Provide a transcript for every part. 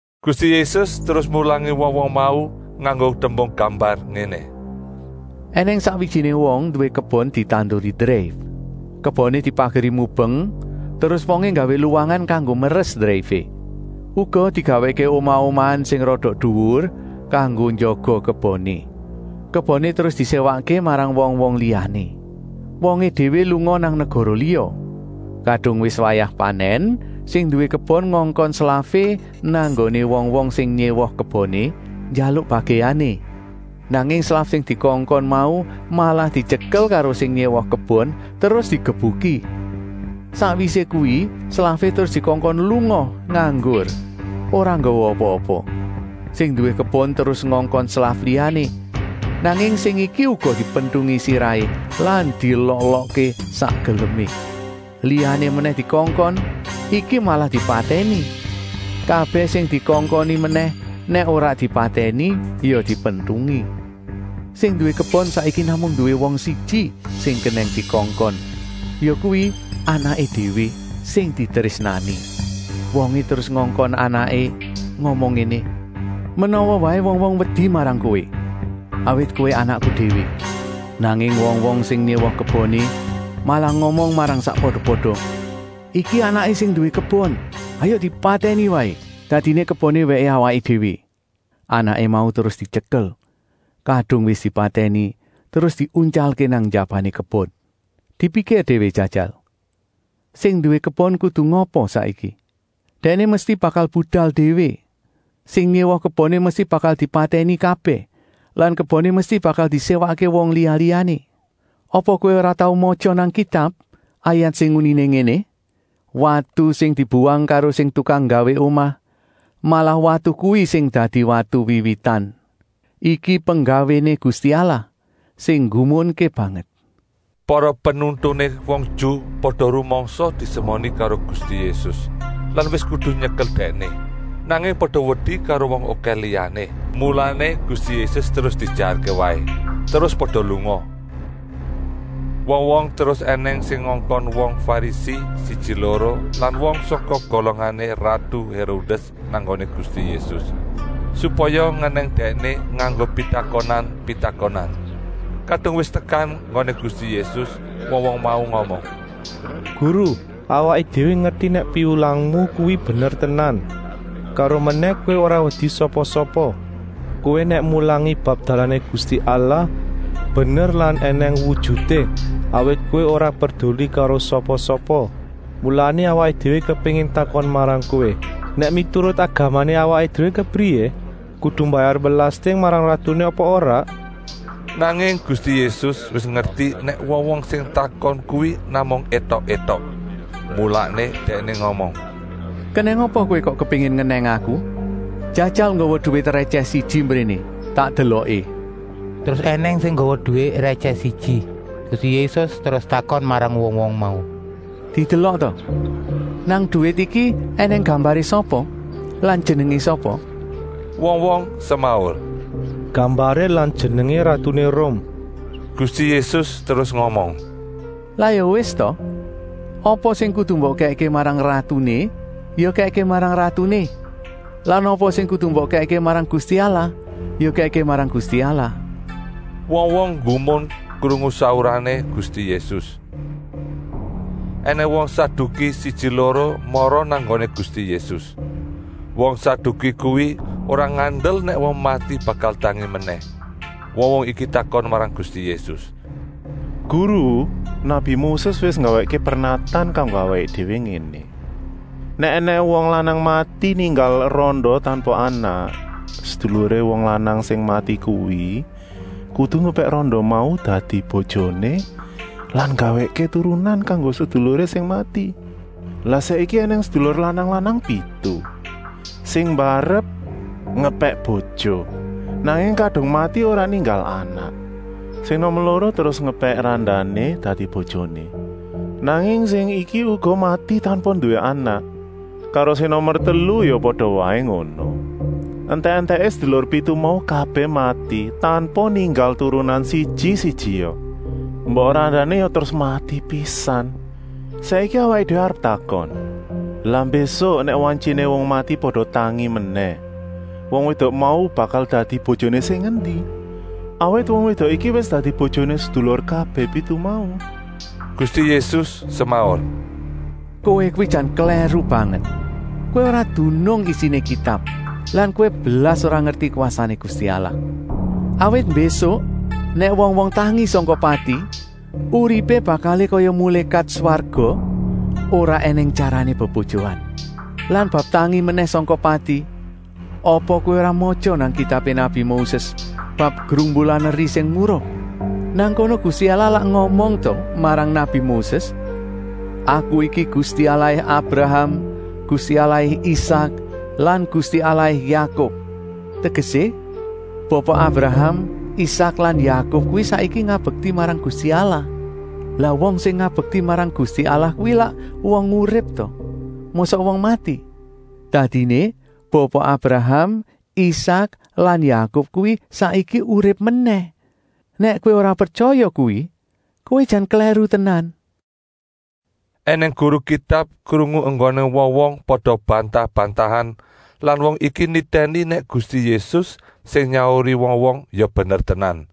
Gusti Yésus terus mulangi wong-wong mau nganggo tembung gambar ngéné: “Enèng sakwijiné wong nduwé kebon ditanduri dreif. Keboné dipageri mubeng terus wongé nggawé luwangan kanggo meres dreifé. Uga digawèkké omah-omahan sing rada duwur kanggo njaga keboné. Keboné terus diséwakké marang wong-wong liyané. Wongé déwé lunga nang negara liya. Kadung wis wayah panèn sing nduwé kebon ngongkon slafé nang nggoné wong-wong sing nyéwa keboné, njaluk bagèané. Nanging slaf sing dikongkon mau malah dityekel karo sing nyéwa kebon terus digebuki. Sakwisé kuwi slafé terus dikongkon lunga nganggur, ora nggawa apa-apa. “Sing nduwé kebon terus ngongkon slaf liyané, nanging sing iki uga dipentungi sirahé lan dielok-elokké sak gelemé. Liyané menèh dikongkon, iki malah dipatèni. Kabèh sing dikongkoni menèh nèk ora dipatèni ya dipentungi. Sing nduwé kebon saiki namung nduwé wong siji sing kenèng dikongkon, yakuwi anaké déwé, sing ditrésnani. Wongé terus ngongkon anaké ngomong ngéné: ‘Menawa waé wong-wong wedi marang kowé, awit kowé anakku déwé!’ Nanging wong-wong sing nyéwa keboné malah ngomong marang sakpada-pada: ‘Iki anaké sing nduwé kebon. Hayuk dipatèni waé, dadiné keboné wèké awaké déwé.’ Anaké mau terus dityekel; kadung wis dipatèni terus diuntyalké nang njabané kebon. “Dipikir déwé jajal. Sing nduwé kebon kudu ngapa saiki? Dèkné mesti bakal budal déwé. Sing nyéwa keboné mesti bakal dipatèni kabèh lan keboné mesti bakal diséwakké wong liya-liyané? Apa kowé ora tau matya nang Kitab, ayat sing uniné ngéné: ‘Watu sing dibuwang karo sing tukang nggawé omah, malah watu kuwi sing dadi watu wiwitan. Iki penggawéné Gusti Allah, sing nggumunké banget.’” Para penuntuné wong Ju pada rumangsa disemoni karo Gusti Yésus lan wis kudu nyekel Dèkné, nanging pada wedi karo wong okèh liyané. Mulané Gusti Yésus terus diejarké waé, terus pada lunga. Wong-wong terus ènèng sing ngongkon wong Farisi siji-loro lan wong sangka golongané ratu Hérodès nang nggoné Gusti Yésus, supaya ngenèng Dèkné nganggo pitakonan-pitakonan. Kadung wis tekan nggoné Gusti Yésus wong-wong mau ngomong: “Guru, awaké déwé ngerti nèk piwulangmu kuwi bener tenan. Karomenèh Kowé ora wedi sapa-sapa. Kowé nèk mulangi bab dalané Gusti Allah bener lan ènèng wujuté, awit Kowé ora perduli karo sapa-sapa. Mulané awaké déwé kepéngin takon marang Kowé. Nèk miturut agamané awaké déwé kepriyé? Kudu mbayar belasting marang ratuné apa ora?” Nanging Gusti Yésus wis ngerti nèk wong-wong sing takon kuwi namung étok-étok. Mulané Dèkné ngomong: “Kenèng apa kowé kok kepéngin ngenèng Aku? Jajal nggawa duwit rètyèh siji mbréné tak deloké.” Terus ènèng sing nggawa duwit rètyèh siji. Gusti Yésus terus takon marang wong-wong mau: “Didelok ta! Nang duwit iki ènèng gambaré sapa lan jenengé sapa?” Wong-wong semaur: “Gambaré lan jenengé ratuné Rum!” Gusti Yésus terus ngomong: “Lah ya wis ta! Apa sing kudu mbok kèkké marang ratuné ya kèkké marang ratuné lan apa sing kudu mbok kèkké marang Gusti Allah ya kèkké marang Gusti Allah.” Wong-wong nggumun krungu saurané Gusti Yésus. Enèng wong Saduki siji-loro mara nang nggoné Gusti Yésus. Wong Saduki kuwi ora ngandel nèk wong mati bakal tangi menèh. Wong-wong iki takon marang Gusti Yésus: “Guru, nabi Moses wis nggawèkké pernatan kanggo awaké déwé ngéné: ‘Nèk ènèng wong lanang mati ninggal randa tanpa anak, seduluré wong lanang sing mati kuwi kudu ngepèk randa mau dadi bojoné lan nggawèkké turunan kanggo seduluré sing mati.’ “Lah saiki ènèng sedulur lanang-lanang pitu. Sing mbarep ngepèk bojo, nanging kadung mati ora ninggal anak. Sing nomer loro terus ngepèk randané dadi bojoné, nanging sing iki uga mati tanpa nduwé anak. Karo sing nomer telu ya pada waé ngono. Entèk-entèké sedulur pitu mau kabèh mati, tanpa ninggal turunan siji-sijia. Mbok randané ya terus mati pisan. Saiki awaké déwé arep takon: lah mbésuk nèk wantyiné wong mati pada tangi menèh, wong wédok mau bakal dadi bojoné sing endi? Awaké déwé takon, awit wong wédok iki wis dadi bojoné sedulur kabèh pitu mau?” Gusti Yésus semaur: “Kowé kuwi jan klèru banget. Kowé ora dunung isiné Kitab lan kowé blas ora ngerti kwasané Gusti Allah. Awit mbésuk nèk wong-wong tangi sangka pati uripé bakalé kaya mulékat swarga, ora ènèng tyarané bebojoan. Lan bab tangi menèh sangka pati, apa kowé ora matya nang kitabé nabi Moses bab grumbulan eri sing murup? Nang kono Gusti Allah lak ngomong ta marang nabi Moses: ‘Aku iki Gusti Allahé Abraham, Gusti Allahé Isak lan Gusti Allahé Yakub.’ Tegesé Bapa Abraham, Isak lan Yakub kuwi saiki ngabekti marang Gusti Allah. Lah wong sing ngabekti marang Gusti Allah kuwi lak wong urip ta, mosok wong mati? Dadiné Bapa Abraham, Isak lan Yakub kuwi saiki urip menèh. Nèk kowé ora pretyaya kuwi, kowé jan klèru tenan!” Enèng guru Kitab krungu enggoné wong-wong pada bantah-bantahan lan wong iki nitèni nèk Gusti Yésus sing nyauri wong-wong ya bener tenan.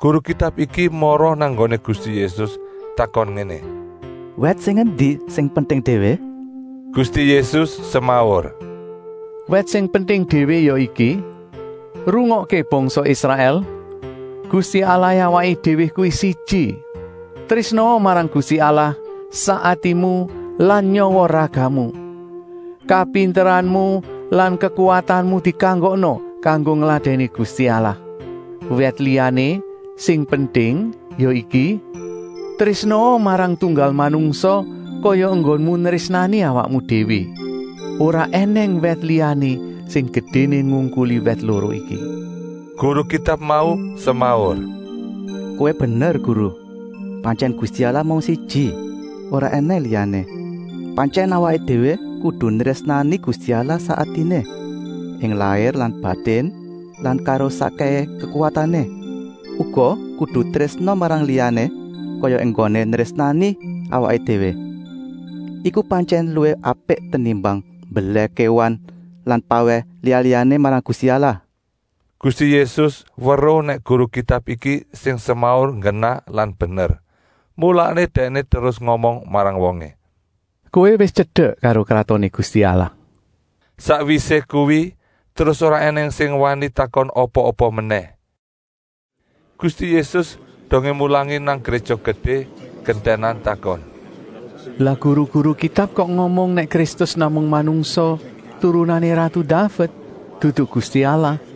Guru Kitab iki mara nang nggoné Gusti Yésus takon ngéné: “Wèt sing endi sing penting déwé?” Gusti Yésus semaur: “Wèt sing penting déwé ya iki: ‘Rungokké bangsa Israèl, Gusti Allahé awaké déwé kuwi siji. Trésnaa marang Gusti Allah sak atimu lan nyawa-ragamu, kapinteranmu lan kekuwatanmu dikanggokna kanggo ngladèni Gusti Allah.’ Wèt liyané sing penting ya iki: ‘Trésnaa marang tunggal manungsa kaya enggonmu nrésnani awakmu déwé.’ Ora ènèng wèt liyané sing gedéné ngungkuli wèt loro iki.” Guru Kitab mau semaur: “Kowé bener, Guru. Pantyèn Gusti Allah mung siji, ora ènèng liyané. Pantyèn awaké déwé kudu nrésnani Gusti Allah sak atiné, ing lair lan batin lan karo sakkèhé kekuwatané. Uga kudu trésna marang liyané kaya enggoné nrésnani awaké déwé. Iku pantyèn luwih apik tenimbang mbelèh kéwan lan pawèh liya-liyané marang Gusti Allah.” Gusti Yésus weruh nèk guru Kitab iki sing semaur nggenah lan bener, mulané Dèkné terus ngomong marang wongé: “Kowé wis tyedek karo Kratoné Gusti Allah.” Sakwisé kuwi terus ora ènèng sing wani takon apa-apa menèh. Gusti Yésus dongé mulangi nang Gréja Gedé gentènan takon: “Lah guru-guru Kitab kok ngomong nèk Kristus namung manungsa turunané ratu Daved, dudu Gusti Allah?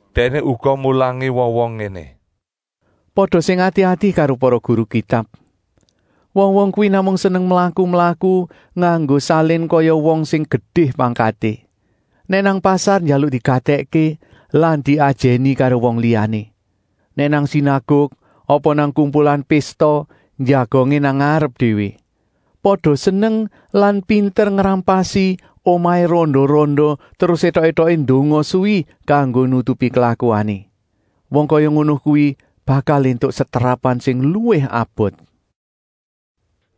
Dèkné uga mulangi wong-wong ngéné: “Pada sing ati-ati karo para guru Kitab. Wong-wong kuwi namung seneng mlaku-mlaku nganggo salin kaya wong sing gedé pangkaté. Nèk nang pasar njaluk digatèkké lan diajèni karo wong liyané. Nèk nang sinaguk apa nang kumpulan pésta njagongé nang ngarep déwé. Pada seneng lan pinter ngrampasi omahé randa-randa terus étok-étoké ndonga suwi kanggo nutupi klakuané. Wong kaya ngono kuwi bakal éntuk setrapan sing luwih abot.”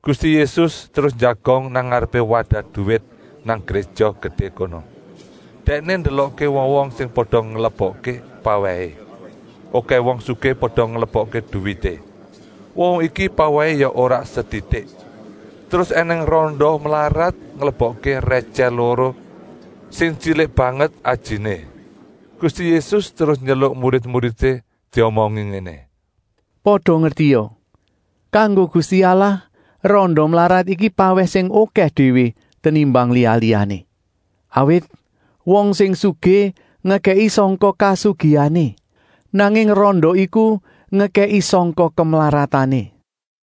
Gusti Yésus terus njagong nang ngarepé wadah duwit nang Gréja Gedé kono. Dèkné ndelokké wong-wong sing pada nglebokké pawèhé. Okèh wong sugih pada nglebokké duwité. Wong-wong iki pawèhé ya ora setitik. Terus ènèng randa mlarat nglebokké rètyèh loro sing tyilik banget ajiné. Gusti Yésus terus nyeluk murid-muridé diomongi ngéné: “Pada ngertia, kanggo Gusti Allah randa mlarat iku pawèh sing okèh déwé tenimbang liya-liyané. Awit wong sing sugih ngekèki sangka kasugihané, nanging randa iku ngekèki sangka kemlaratané.”